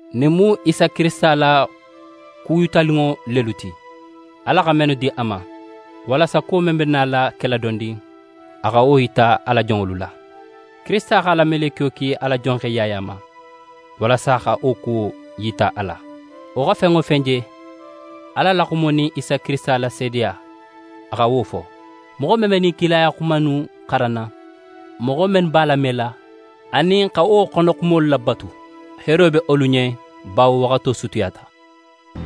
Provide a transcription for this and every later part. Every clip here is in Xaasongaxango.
Ɲinnu mu Isa Kirisita la ku yitaninŋo lelu ti, Ala xa mennu di a ma, walasa kuwo men be nala kela dondin, a xa wo yita a la jonŋolu la. Kirisita x'a la melekiyo ki a la jonxe Yaya ma, walasa a xa wo kuwo yita a la. Wo xa fen wo fen je: Ala la xumo anin Isa Kirisita la seedeya, a xa wo fo. Moxo men be ɲin kilaya xuma innu xaranna, moxo mennu b'a lamela anin x'a xono xumolu labatu, heero be wolu ɲen bawo waxato sutiyata.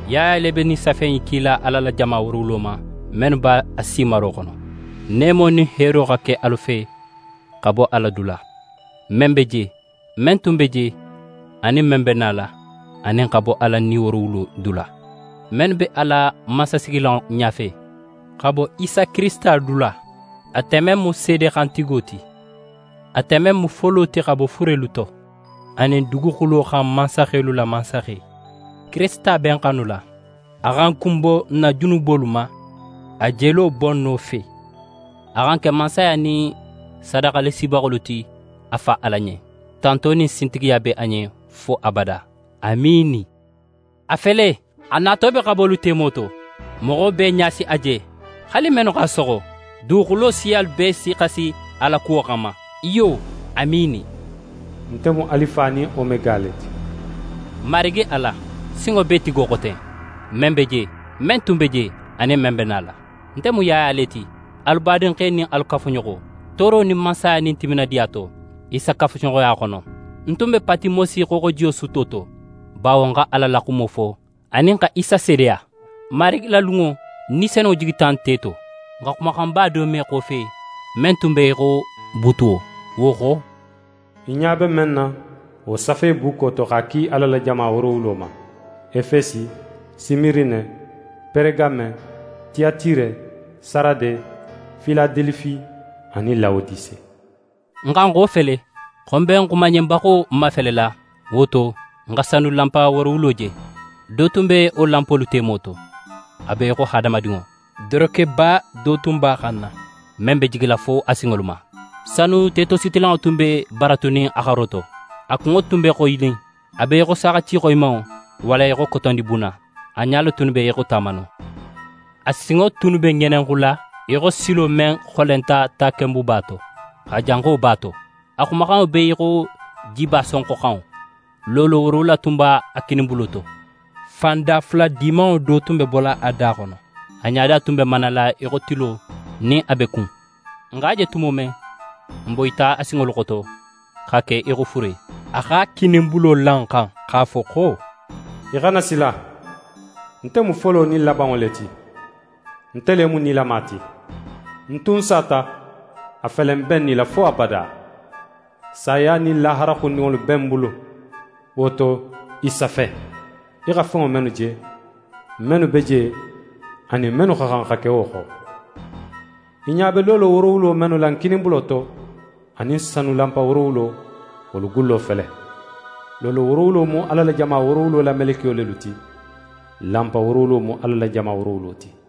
Yaya le be ɲin safe in kila Ala la jama woorowulo ma, mennu be Asi maro xono: Neemo nin heero xa ke alu fe xa bo Ala dula, men be je, men tun be je, anin men be nala; anin xa bo Ala Ni woorowulo dula, mennu be a la mansasigilanŋo ɲafe, xa bo Isa Kirisita dula, ate men mu seede xantigo ti, ate men mu folo ti xa bo furelu to, anin duguxulo xan mansaxelu la Mansaxe. Kirisita be n xanula, a xa n kunbo n na junubolu ma a jelo bonno fe. A xa n ke mansaya nin sadaxalasibaxolu ti a Fa Ala ɲen. Tanto nin sintigiya be a ɲen fo abada! Amiini. A fele, a nato be xabolu temo to, moxo bee ɲa si a je, haali mennu x'a soxo. Duguxulo siyalu bee si xasi a la kuwo xanma. Iyo! Amiini! «Nte mu Alifa nin Omega le ti», Marigi Ala, Sinŋobeetigo xo ten, men be je, men tun be je, anin men be nala. Nte mu Yaya le ti, alu badinxe nin alu kafuɲoxo, tooro nin Mansaya nin timinadiya to, Isa kafuɲoxoya xono. Ń tun be Patimosi xooxoji sutto to, bawo ń xa Ala la xumo fo anin xa Isa seedeya. Marigi la lunŋo, Ni Senunŋo jigita nte to. Ń xa xumaxanba do me ń xofe men tun be í xo buutuwo. Wo xo: «Í ɲa be men na, wo safe bukko do to, x'a ki Ala la jama woorowulo ma: Efesi, Simirine, Peregame, Tiyatire, Sarade, Filadelifi anin Lawodise.» Ń xa ń xofele xo ń be ń xumanɲenbaxo mafelela. Wo to, ń xa sanu lanpa woorowula je. Do tun be wo lanpolu temo to, a be í xo hadamadinŋo. Dorokeba do tun b'a xanna, men be jigila fo a sinŋolu ma, sanu tetositilanŋo tun be baratunin a xaro to. A kunŋo tun be xoyinin a be í xo saaxati xoyimanŋo walla í xo kotondibuna. A ɲalu tunnu be í xo tamano. A sinŋo tunnu be ŋelenxula í xo silo men xolenta takenbuba to, x'a janxo b'a to. A xumaxanŋo be í xo jiba sonxoxanŋo. Loolo woorowula tun be a kininbulo to, fan dafula dimanŋo do tun be bola a da xono. A ɲada tun be manala í xo tilo, nin a be kun. Ń x'a je tumo men, ń boyita a sinŋolu xoto xa ke í xo fure. A x'a kininbulo la ń xan x'a fo xo: «Í xana sila! Nte mu folo nin labanŋo le ti. Nte le mu nilama ti. Ń tun sata, a fele ń be ń nila fo abada. Saya nin lahara xundinŋolu be ń bulu. Wo to, i safe, í xa fenŋo mennu je, mennu be je, anin mennu xa xan xa ke wo xo. Í ɲa be loolo woorowulo mennu la ń kininbulo to, anin sanu lanpa woorowulo, wolu gullo fele: Loolo woorowulo mu Ala la jama woorowulo la melekiyo lelu ti, lanpa woorowulo mu Ala la jama woorowulo ti.»